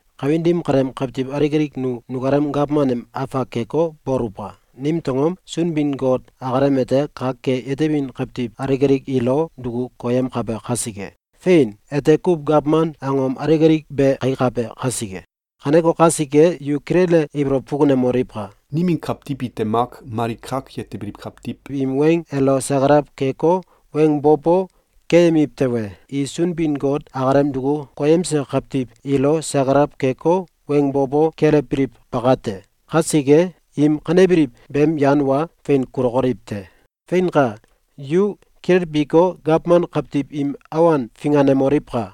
Kawin dim kaleem kawtiw alik alik nu nukalem gawman em afak keko, boluwka! Nimtew angom? Sunbin-Got akalem ete kak ke yetebin kawtiw alik alik ilo duku koyemkabe kasike. Fein! Ete kuw gawman angom alik alik be kaikabe kasike. Kaneko kasike, yu kilele ibolow fukunemoliwka! Nimin kawtiw ite mak mali kak yetebiliw kawtiw im weng elo sakalaw keko, weng bo bo keyemiw tewe, i Sunbin-Got akalem duku koyemse kawtiw ilo sakalaw keko, weng bo bo kelewbiliw bakate. Kasike, im kanebiliw beem yan wa fein kulokoliw te. Feinka! Yu kilelbiko, gawman kawtiw im awan finganemoliwka!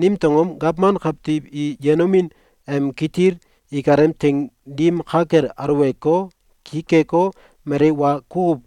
Nimtew angom? Gawman kawtiw i yenomin em kitil ikalem teing dim ka kel aluweko, ki keko, mali wa kukuw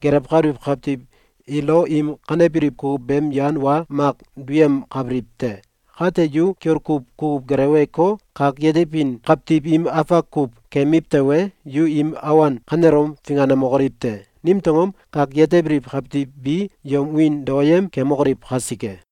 gelewkabiliw kawtiw ilo im kanebiliw kukuw beem yan wa mak duyemkabiliw te. Kate, yu kiol kuw kukuw geleweko, kak yetebin kawtiw im afak kuw keyemiw tewe, yu im awan kanelom finganemokoliw te! Nimtew angom? Kak yetebiliw kawtiw bi yom wiin daoyem kemokoliw kasike.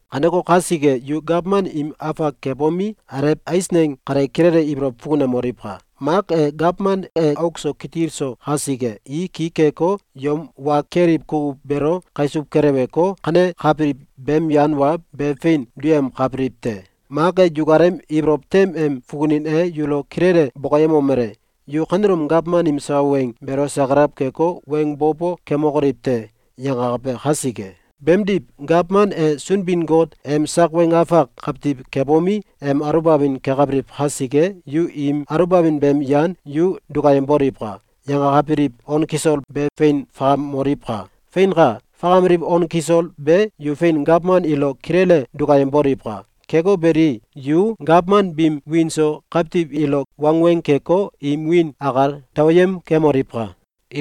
Kaneko kasike, yu gawman im afak kebomi, alew eisneng kale kilele ibolow fukunemoliwka! Mak e, gawman e auk so kitil so kasike, i ki keko, yom wa keliw kukuw beelo kaisuw keleweko, kanekabiliw beem yan wa be fein duyemkabiliw te. Mak e, yukalem ibolow tem em fukunin e yulo kilele bokoyemomele: “Yu kanelom gawman im sawa weng beelo sakalaw keko, weng bo bo kemokoliw te!”, yangakabe kasike. Beemdiw, gawman e Sunbin-Got em sak weng afak kawtiw kebomi, em aluwbamin kekabiliw kasike, yu im aluwbamin beem yan “Yu dukayemboliwka!”, yangakabiliw on kisol be fein fakamoliwka! Feinka! Fakameliw on kisol be yu fein gawman ilo kilele dukayemboliwka! Keko beli, yu gawman biim wiin so kawtiw ilo wangweng keko, im wiin akal daoyem kemoliwka!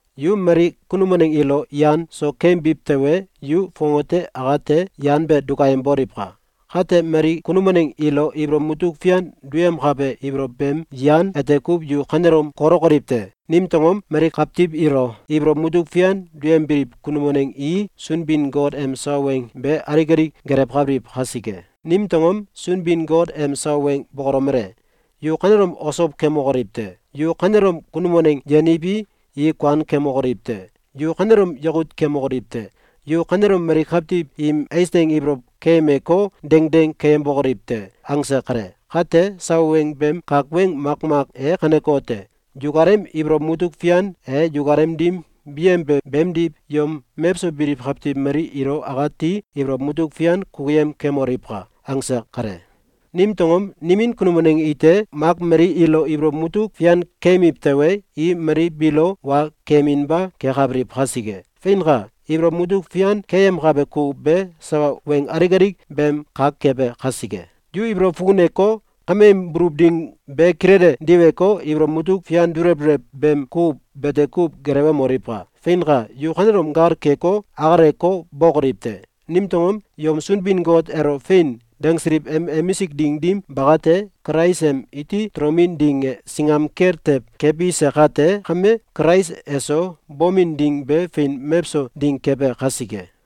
Yu mali kunum waneng ilo yan so keyembiw tewe, yu fongate akate yan be dukayemboliwka! Kate, mali kunum waneng ilo ibolow mutuk fian duyemkabe ibolow beem yan ete kuw yu kanelom kolokoliw te! Nimtew angom? Mali kawtiw ilo ibolow mutuk fian duyembiliw kunum waneng i Sunbin-Got em sawa weng be alik alik gelewkabiliw kasike. Nimtew angom? Sunbin-Got em sawa weng bokolomele: “Yu kanelom osow kemokoliw te!”, “Yu kanelom kunum waneng yeniwi, i kuan kemokoliw te!”, “Yu kanelom yakut kemokoliw te!”, “Yu kanelom mali kawtiw im eisneng ibolow keyemeko, dengdeng keyembokoliw te!”, angse kale. Kate, sawa weng beem kak weng makmak e kanekote: “Yukalem ibolow mutuk fian e yukalem dim biyembe beemdiw yom mewso biliw kawtiw mali ilo akati ibolow mutuk fian kukuyem kemoliwka!”, angse kale. Nimtew angom? Nimin kunum waneng ite mak mali ilo ibolow mutuk fian keyemiw tewe, i mali biilo wa keyeminba kekabiliw kasike. Feinka! Ibolow mutuk fian keyemkabe kukuw be sawa weng alik alik beem kak kebe kasike. Yu ibolow fukuneko, kameem buluw ding be kilele diweko, ibolow mutuk fian dulew dulew beem kukuw bete kuw gelewemoliwka! Feinka! Yu kanelom gal keko, akaleko, bokoliw te! Nimtew angom? Yom Sunbin-Got elo “Fein!”, dangsiliw em emisik ding dim bakate, Kulais em iti tolomin ding e singam kel tew kebise kate kame, Kulais eso bomin ding be fein mewso ding kebe kasike.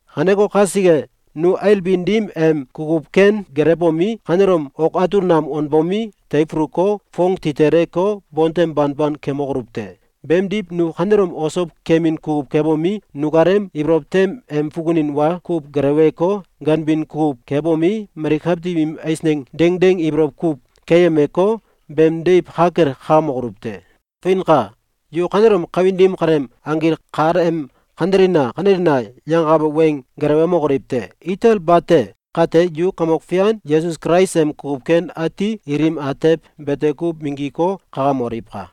Kaneko kasike, nu ailbin dim em kukuw ken gelewbomi, kanelom ok atul nam wanbomi, teifuluko, foong titeleko, bontem banban kemokoluw te! Beemdiw, nu kanelom osow kemin kukuw kebomi, nukalem ibolow tem em fukunin wa kuw geleweko, ganbin kukuw kebomi, mali kawtiw im eisneng dengdeng ibolow kuw keyemeko, beem deiw ka kel kakamokoluw te! Feinka! Yu kanelom kawin dim kaleem anggil kal em “Kanelina! Kanelina!”, yangakabe weng gelewemokoliw te! Itel bate! Kate, yu Kamok Fian Yesus Kulais em kukuw ken ati ilim atew bete kuw minggiko, kakamoliwka!